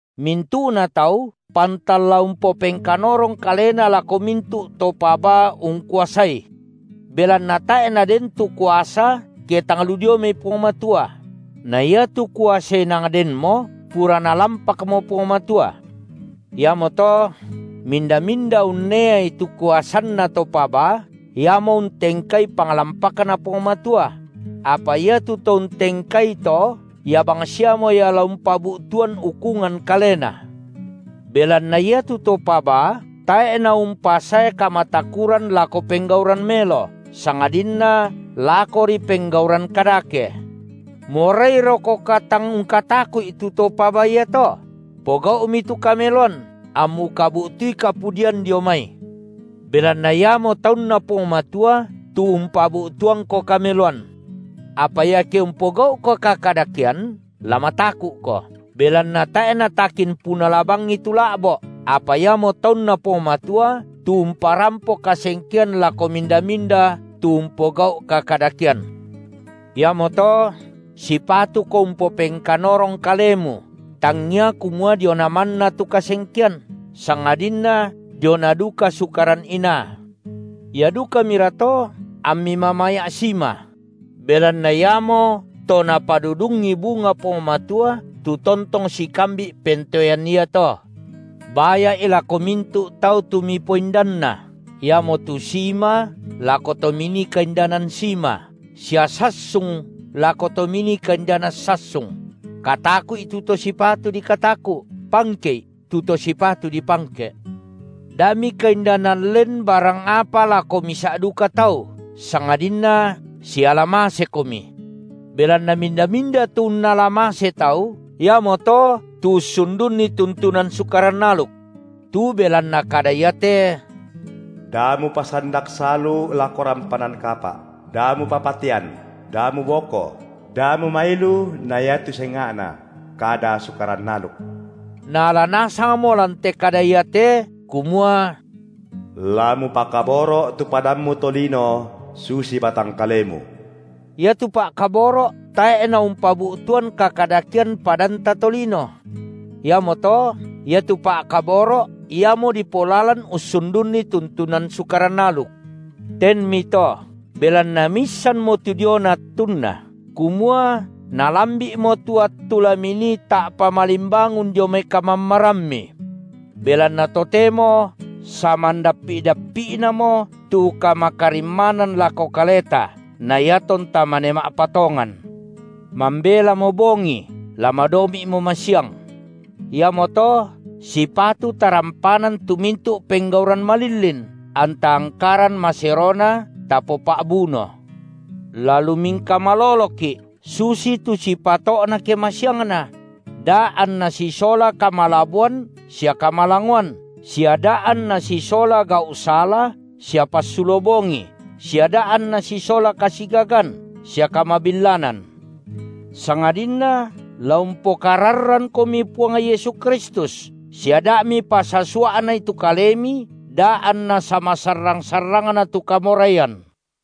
Mintu’na tau pantan la umpopengkanorong kalena lako mintu’ to pabaa ungkuasai. Belanna tae’ naden tu kuasa ke tang lu dioi mai Puang Matua; na iatu kuasa inang denmo pura Nalampakmo Puang Matua. Iamoto minda-minda unneai tu kuasanna to pabaa, iamo untengkai panglampakNa Puang Matua; apa iatu to untengkai to, ia bangsiamo ia la umpabu’tuan ukungan kalena. Belanna iatu to pabaa tae’ naumpasae kamatakuran lako penggauran melo, sangadinna lakori penggauran kadake. Morairokoka tang ungkataku’i tu to pabaa iato? Pogau’mi tu kameloan, ammu kabu’tui kapudian dio mai. Belanna iamo taunNa Puang Matua tu umpabu’tuangko kameloan. Apa iake umpogau’ko kakadakean, la mataku’ko, belanna tae’ natakin punala bangi tu la’bo’, apa iamo taunNa Puang Matua, tu umparampo kasengkean lako minda-minda tu umpogau’ kakadakean. Iamoto sipatuko umpopengkanorong kalemu, tangia kumua diona manna tu kasengkean, sangadinna diona duka sukaran inaa. Ia dukamira to ammi mamaya’ sima; belanna iamoto Napadudungi bunga Puang Matua tu tontong sikambi’ pentoean iato. Baya’i lako mintu’ tau tu mipoindanna, iamotu sima lako to minii kaindanan sima, sia sassung lako to minii kaindanan sassung; kataku’i tu to sipatu dikataku’, pangke’i tu to sipatu dipangke’. Da mikaindanan len barang apa lako misa’ duka tau, sangadinna siala masekomi. Belanna minda-minda tu unnala mase tau, iamoto tu ussundunni tuntunan Sukaran aluk. Tu belanna kada iate: Da mupasandak salu lako rampanan kapa’, da mupapatean, da muboko, da mumailu na iatu senga’na kada Sukaran aluk, naala nasangmo lan te kada iate kumua: La mupakaboro’ tu padammu tolino susi batang kalemu. Iatu pa’kaboro’ tae’ naumpabu’tuan kakadakean padanta tolino. Iamoto iatu pa’kaboro’ iamo dipolalan ussundunni tuntunan Sukaran aluk. Tenmito, belanna miissanmo tu diona attunna, kumua nalambi’mo tu attu la minii ta’pa malimbangun dio mai kamammarammi. Belanna totemo samandappi’-dappi’namo tu kamakarimmanan lako kaleta na iatonta mane ma’patongan. Mambelamo bongi, la madomi’mo masiang. Iamoto sipatu tarampanan tu mintu’ penggauran malillin, anta angkaran maserona tapopa’buno. La lumingka maloloki’, susitu sipato’na ke masiangna; da’ anna sisola kamalaboan sia kamalangoan sia da’ anna sisola gau’ sala sia passulo bongi sia da’ anna sisola kasigagan sia kamabillanan. Sangadinna la umpokararrankomi Puang Yesu Kristus, sia da’ mipasasua’nai tu kalemi da anna samasarrang-sarrangna tu kamoraian.